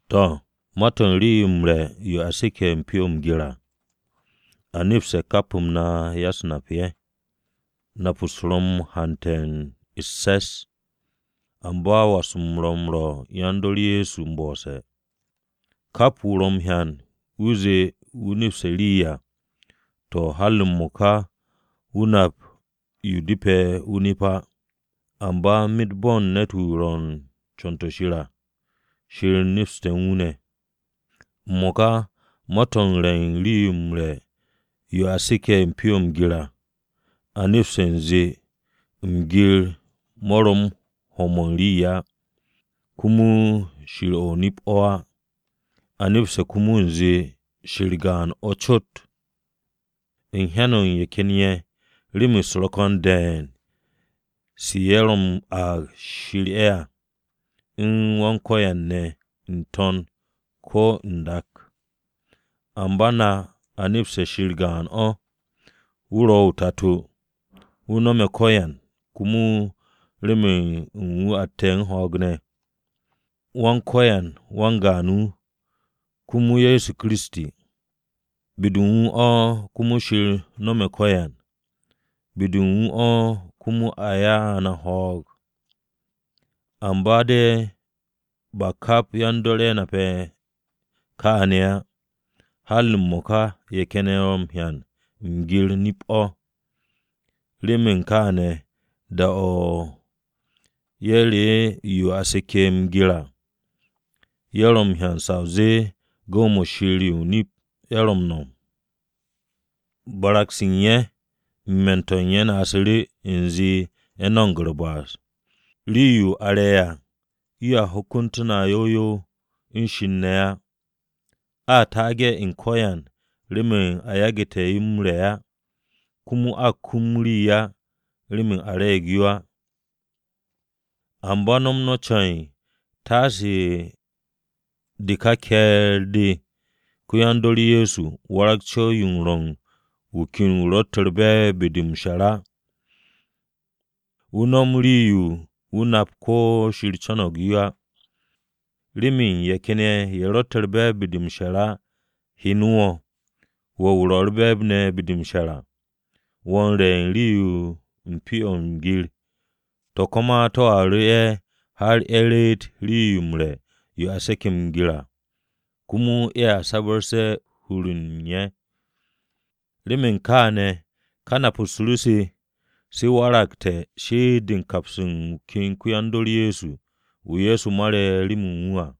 To̱, ma-to̱ u̱n rii-yo m-re̱ yo a seke̱ pyo-o̱ m-gir à, a nepste̱ kap-m na ya-u̱s-nap-ye̱. Nap-u̱s na ro̱ u̱n hante̱ u̱s-se̱s, amba was-m ro̱ m-rwo̱ yan-dor Ye̱so m-bo'ose̱. Kap wu̱ ro̱ m-hyan wu̱ zee wu̱ nepste̱ rii à, to̱ har m-mo̱ka wu̱ nap yo depe̱ wu̱ nep á. Amba myet bo̱n ne̱t-wu̱ ro̱ u̱n co̱n-to̱ Shir à, Shir nepste̱ u̱n wu̱ ne̱. M-mo̱ka ma-to̱ u̱n re̱ u̱n rii-yo m-re̱ yo a seke̱ pyo-o̱ m-gir à, a nepste̱ u̱nze, m-gir mo̱ ro̱ u̱n ho̱-mo̱ rii á. Komo shir o̱ o-nip o̱ á, a nepste̱ komo u̱nze Shir gaan-o̱ cot. U̱n hyan-o̱ u̱n ye̱ ken ye̱, rem-u̱s ro̱ ko̱n de̱e̱n se ye̱ ro̱ m-aag “shir-ye̱” à u̱n “yan-ko̱yan-ne̱” n-to̱n ko̱ n-dak. Amba na a nepse̱ Shir gaan-o̱. Wu̱ ro̱ o-Tato, wu̱ no̱me̱ ko̱yan komo remen u̱n wu̱ atte̱ u̱n ho̱o̱g ne̱. Wan-Ko̱yan, wan-gaan wu̱, komo Ye̱so Kiristi. Be-de u̱n wu̱ o̱ komo Shir no̱me̱ ko̱yan, be-de u̱n wu̱ o̱ komo a ya'u̱ na ho̱o̱g. Amba de̱ ba kap yan-dor ye̱ nape̱ kaane̱ á. Har m-mo̱ka ye̱ ken ye̱ ro̱ hyan m-gir nip-o̱, remen kaane̱ da-o̱ ye̱ re'e̱ yo a seke̱ m-gir à, ye̱ ro̱ m-hyan sa o zee gu̱w-mo̱ shir-ye̱ o-nip ye̱ ro̱ m-no̱m. Barag-se u̱n ye̱ u̱n hur-de u̱n ye̱ kapsu̱ru̱ ye̱ u̱nze ye̱ no̱mo̱g u̱r-ba'as. Rii-yo a m-re̱ à yoa hyokontu̱ no̱ yow yow u̱n Shir ne̱ á. A taage̱ u̱n ko̱yan remen a yagu̱te̱ yo m-re̱ á. Komo a kum rii, remen a re̱e̱g yo á. Amba no̱m no̱ ce̱e̱n taase de ka ke̱e̱r-de ko-yan-dor Ye̱so warag co̱w-yo rwo̱ u̱n wu̱ ken wu̱ ro̱tte̱ u̱r-be̱e̱b be-de m-she̱r á wu̱ no̱m rii-yo wu̱ nap ko̱ Shir co̱no̱g yo á. Remen ye̱ ken ye̱ ye̱ ro̱tte̱ u̱r-be̱e̱b be-de m-she̱r á hyene̱ wo̱, wo̱ wu̱ ro̱ u̱r-be̱e̱b ne̱ be-de m-she̱r à, wo̱ u̱n re̱ u̱n rii n-me̱ u̱n pyo-o̱ m-gir, to̱ ka ma to̱a ru̱ ye̱ har ye̱ reet rii-yo m-re̱ yo a seke̱ m-gir à, komo ye̱a sabre̱ u̱n hur-de u̱n ye̱. Remen kaane̱ ka nap-u̱s ru se, se a wakte̱ shi'it-de u̱n kaps u̱n wu̱ ken ko-yan-dor-wu̱, wu̱ Ye̱so Kiristi mare̱ remen wu̱ à.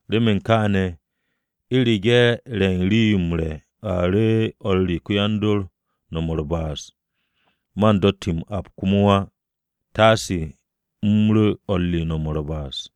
Remen kaane̱, u̱rege̱ re̱ u̱n rii-yo m-re̱ a ru̱ o̱r re ko-yan-dor no̱m u̱r-ba'as, man do ti u̱r-ap komo á, taasu̱ u̱m ru̱ o̱r re no̱m u̱r-ba'as.